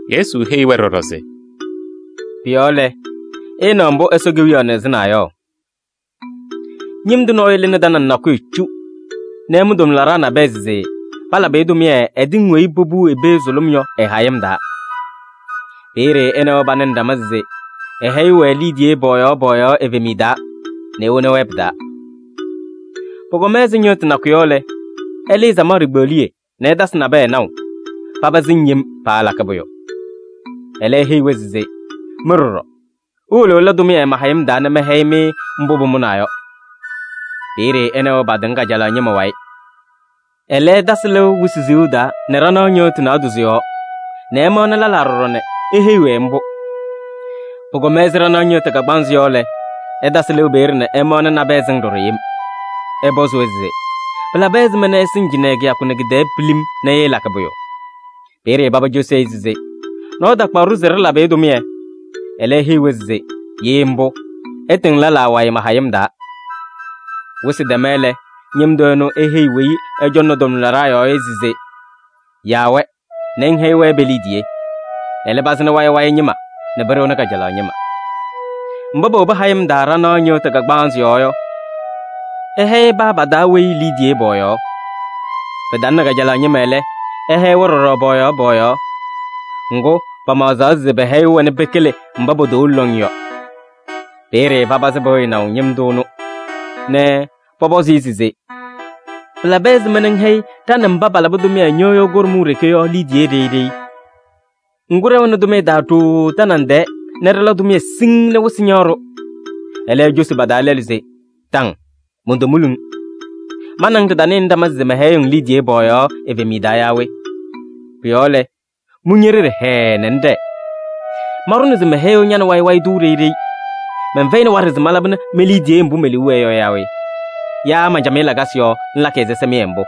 Yesu heyi-wɛ ɖɔɖɔ se: “Pʋ-yɔɔ lɛ, ɩɩnaɣ mbʋ Ɛsɔ Kewiyaɣ nɩɣzɩnaa yɔ: ñɩm tʋ nɔɔyʋ lɩnɩ tanaŋ nakʋyʋ cu nɛ ɛmʋ tʋmlaɖaa nabɛyɛ se palabɩ-ɩ tʋmɩyɛ ɛ-tɩŋ weyi popuʋ i-pee sʋlʋm yɔ ɩ-hayɩm taa. Peeye ɛ nɛ wɛ panɩnɩ ɖama se ɛhɛyɩɣ-wɛ liidiye pɔɔyaɣ pɔɔyaɣ evemiye taa nɛ ewoni-wɛ pɩ-taa. Pʋkɔma ɛzɩ ñɩɣtʋ nakʋ yɔ lɛ, ɛlɩɩ samaɣ ɖikpeɣliye nɛ ɛtasɩ nabɛyɛ naʋ, paba sɩŋ yem, paalakɩ pʋyʋ. Ɛlɛ eheyi-wɛ se: ‘Mɩ ɖɔɖɔ iwolo ɩla tʋmɩyɛ ma-hayɩm taa nɛ mɛhɛyɩ-mɩ mbʋ pʋmʋnaa yɔ.’ Peeye ɛ nɛ wɛ patɩŋ kajalaɣ ñɩma wayɩ. Ɛlɛ ɛtasɩ lɩʋ wɩsɩ siɣu taa nɛ ɖanaɣ ñɩɣtʋ naadozo yɔɔ nɛ ɛmaɣnɩ lɛlaa ɖɔɖɔ nɛ eheyi-wɛ mbʋ. Pʋkɔma ɛzɩ ɖanaɣ ñɩɣtʋ kagbaanzɩ yɔ lɛ, ɛtasɩ lɩʋ peeye nɛ ɛmaɣnɩ nabɛyɛ sɩŋ ɖɔɖɔ yem. Ɛpɔzɩ-wɛ se: ‘Pɩlabɩ ɛzɩma nɛ ɩsɩŋ cɩnɛ kɩyakʋ nɛ kɩ-tɛɛ pilim nɛ ɩɩlakɩ pʋyʋ?’ Peeye paba cosi-i se: ‘Nɔɔyʋ takpaɣ-ɖʋ se ɖɩlabɩ-ɩ tʋmɩyɛ.’ Ɛlɛ eheyi-wɛ se: ‘Ye mbʋ, ɩtɩŋ lɛlaa wayɩ ma-hayɩm taa.’ “Wɩsɩ tɛma lɛ, ñɩm tʋ ɛnʋ eheyi weyi ɛcɔŋnɩ tʋmlaɖaa yɔɔ yɔ se: ‘Yaa-wɛ nɛ ŋhɛyɩ-wɛ pe-liidiye. Ɛlɛ, pazɩnɩ wayɩ wayɩ ñɩma nɛ pɩɖɩɣnɩ kajalaɣ ñɩma.’ Mba powobi hayɩm taa ɖanaɣ ñɩɣtʋ kagbaanzɩ yɔɔ yɔ, ɛhɛyɩ paa pa-taa weyi liidiye pɔɔyaɣ. Pɩtalɩnɩ kajalaɣ ñɩma lɛ, ɛhɛyɩ-wɛ ɖɔɖɔ pɔɔyaɣ pɔɔyaɣ. Ŋgʋ, pamaɣzaɣ se pɛhɛyɩɣ-wɛ nɛ pɩkɩlɩ mba potowolo lɔŋ yɔ. Peeye papazɩ pɩɣyɩnaʋ ñɩm tʋ ɛnʋ nɛ pɔpɔzɩ-ɩ se: ‘Pɩlabɩ ɛzɩma nɛ ŋhɛyɩ ɖa nɛ mba palabɩ tʋmɩyɛ ñɩɣyʋ kʋɖʋm ɖeke yɔ liidiye ɖeyi ɖeyi? Ŋgʋ, ɖɛwɛnɩ tʋmɩyɛ taa ɖooo tanaŋ tɛɛ nɛ ɖɩla tʋmɩyɛ siŋŋ nɛ wɩsɩ ñaɣ-ɖʋ!’ Ɛlɛ, ecosi pa-taa lɛlʋ se: ‘Taŋ! Montomuli-ŋ. Ma nɛ ŋ ɖɩtanɩnɩ ɖama se mɛhɛyɩɣ-ŋ liidiye pɔɔyaɣ evemiye taa yaa we? Pʋ-yɔɔ lɛ, mʋ ñe-ɖeɖe hɛɛɛ nɛ ŋɖɛɛ. Manɖʋna se mɛhɛyɩɣ ña nɛ wayɩ wayɩ tʋ ɖeyi ɖeyi. Mɛnfɛyɩnɩ waɖɛ se malabɩnɩ me-liidiye mbʋ me-liu wɛɛ yɔ yaa we? Yaa man-camɩyɛ lakasɩ yɔɔ ŋlakɩ ɛzɩsɛmɩyɛ mbʋ?’”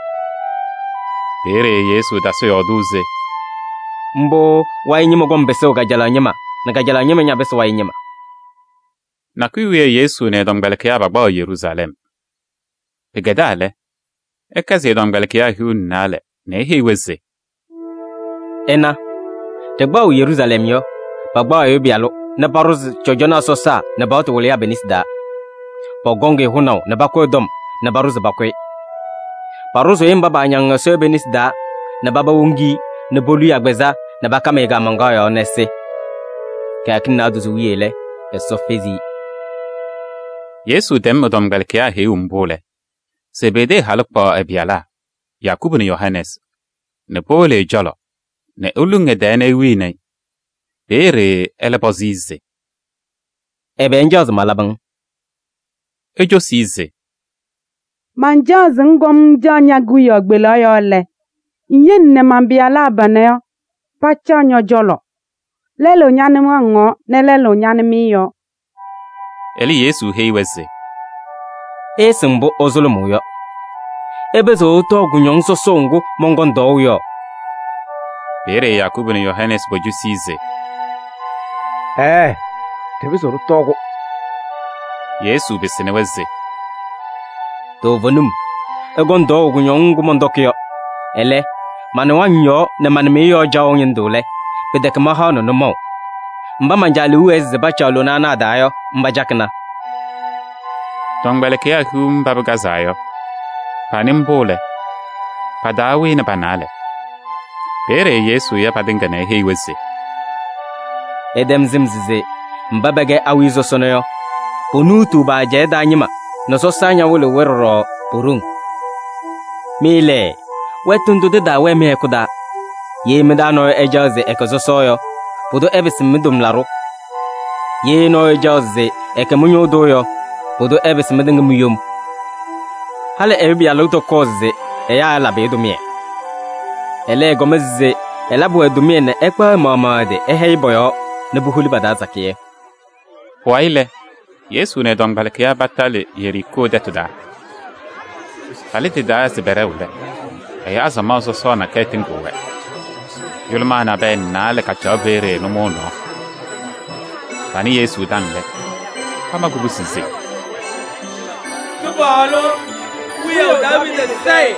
Peeye Yesu tasɩ yɔɔdʋʋ se: “Mbʋ wayɩ ñɩma kɔŋ pɩsʋʋ kajalaɣ ñɩma nɛ kajalaɣ ñɩma ñapɩsɩ wayɩ ñɩma.” Nakʋyʋ wiye Yesu nɛ ɛ-tɔmkpɛlɩkɩyaa pakpaɣaɣ Yeruusalɛm. Pɩkɛdaa lɛ, ɛkɛsɩ ɛ-tɔmkpɛlɩkɩyaa hiu nɛ naalɛ nɛ eheyi-wɛ se: “Ɩna, ɖɩkpaɣʋ Yeruusalɛm yɔ, pakpaɣ Ɛyʋ Pɩyalʋ nɛ paɖʋzɩ cɔjɔnaa sɔsaa nɛ paɣtʋ wɩlɩyaa pe-nesi taa. Pɔkɔŋ-ɩ hʋnaʋ nɛ pakʋ ɛ-tɔm nɛ paɖʋ se pakʋ-ɩ. Paɖʋzʋʋ-ɩ mba paañaŋ Ɛsɔ yɔ pe-nesi taa nɛ paba woŋ-i nɛ polu-i agbazɛɛ nɛ pakam-ɩ kaamaŋkaɣ yɔɔ nɛ ɛsɩ. Kɩyakɩŋ naadozo wiye lɛ, Ɛsɔ fezi-i.” Yesu tɛm ɛ-tɔmkpɛlɩkɩyaa heyuu mbʋ lɛ, Zebedee halʋ kpaɣ ɛ-pɩyalaa Yakubu nɛ Yohanɛɛsɩ nɛ powolo ɛ-cɔlɔ nɛ eluŋ ɛ-tɛɛ nɛ ewini-i. Peeye ɛlɛ pɔzɩ-ɩ se: “Ɛbɛ ŋcaɣ se malabɩ-ŋ?” Ecosi-i se: “Mancaɣ se ŋkɔm ŋcaɣ ñe-kewiyaɣ kpelaɣ yɔɔ lɛ, ŋyele nɛ man-pɩyalaa panɛ pacaɣ ñɔ-cɔlɔ: lɛlʋ ña-nɩwaŋ yɔɔ nɛ lɛlʋ ña-nɩmɩyɛ yɔɔ.” Ɛlɛ, Yesu heyi-wɛ se: “Ɩɩsɩŋ mbʋ ɩsʋlʋmʋʋ yɔ. Ɩpɩzɩɣ ɩtɔɔ kʋñɔŋ sɔsɔʋ ŋgʋ mɔnkɔŋ tɔɔʋ yɔ?” Peeye Yakubu nɛ Yohanɛɛsɩ pocosi-i se: “Ɛɛɛ! Ɖɩpɩzɩɣ ɖɩtɔɔ-kʋ.” Yesu pɩsɩnɩ-wɛ se: “Toovenim ɩkɔŋ tɔɔʋ kʋñɔŋ ŋgʋ mɔntɔkɩ yɔ. Ɛlɛ, ma-nɩwaŋ yɔɔ nɛ ma-nɩmɩyɛ yɔɔ caɣʋ ñɩndʋ lɛ, pɩtɛkɛ mahaɣnɩ nʋmɔʋ. Mba man-Caa liu wɛɛ se pacaɣ lona ana a-taa yɔ, mba cakɩna.” Tɔmkpɛlɩkɩyaa hiu mba pɩkazaa yɔ, panɩ mbʋ lɛ, pa-taa wɩnɩ pa-naalɛ. Peeye Yesu ya patɩŋa nɛ eheyi-wɛ se: “Ɩtɛm sɩm se mba pɛkɛ awiya sɔsɔna yɔ, ponuutuu pa-ajɛɛ taa ñɩma nɛ sɔsaa ñawɩlɩɣ-wɛ ɖɔɖɔ po-ɖoŋ. Mɩ lɛ, wɛtʋ ndʋ tɩtaawɛɛ mɩ-hɛkʋ taa. Ye mɩ-taa nɔɔyʋ ɛcaɣ se ɛkɛ sɔsɔ yɔ, pʋdʋ ɛpɩsɩ mɩ-tʋmlaɖʋ. Ye nɔɔyʋ ɛcaɣ se ɛkɛ mɩ-ñʋʋ tʋ yɔ, pʋdʋ ɛpɩsɩ mɩtɩŋa mi-yom. Halɩ Ɛyʋ Pɩyalʋ tɔkɔɔ se ɛyaa ɛlabɩ-ɩ tʋmɩyɛ. Ɛlɛ, ɛkɔma se ɛlabɩ-wɛ tʋmɩyɛ nɛ ɛkpaɣ ɛ-maɣmaɣ ɛ-tɩ ɛhɛyɩ pɔ-yɔɔ nɛ puholi pa-taa sakɩyɛ.” Pʋwayɩ lɛ, Yesu nɛ ɛ-tɔmkpɛlɩkɩyaa patalɩ Yeriikoo tɛtʋ taa. Palɩ tɩ-taa se pɛɖɛɣ lɛ, ɛyaa samaɣ sɔsɔɔ nakɛyɛ tɩŋɩɣ-wɛ. Yʋlʋmaa naalɛ nabɛyɛ kacaɣ peeye nʋmɔʋ nɔɔ. Panɩ Yesu taŋ lɛ, pama kubusi se: “Kɩpaɣlʋ, wiyaʋ Daaviidi sayɩ!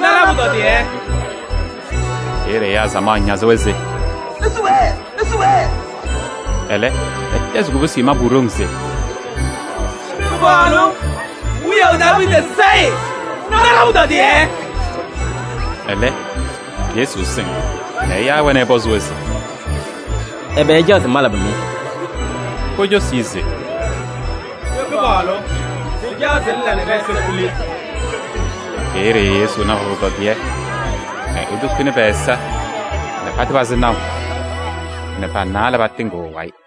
Na ɖa-pʋtɔdɩyɛ.” Peeye ɛyaa samaɣ ñazɩ-wɛ se: “Isu peeye!” Ɛlɛ, pɛtɛzɩ kubusi mabʋ ɖoŋ se: “Kɩpaɣlʋ, wiyaʋ Daaviidi Sayɩ! Na ɖa-pʋtɔdɩyɛ.” Ɛlɛ, Yesu sɩŋ nɛ ɛyaa-wɛ nɛ ɛpɔzɩ-wɛ se: “Ɛbɛ ɩcaɣ se malabɩ-mɩ?” Pocosi-i se: “Kɩpaɣlʋ! Ɖɩcaɣ se ŋla nɛ ɖɛ-ɛza kuli.” Peeye Yesu na pa-pʋtɔdɩyɛ nɛ etukuni pɛ-ɛza nɛ patɩpazɩ naʋ nɛ pa-naalɛ patɩŋɩɣ ɛ-wayɩ.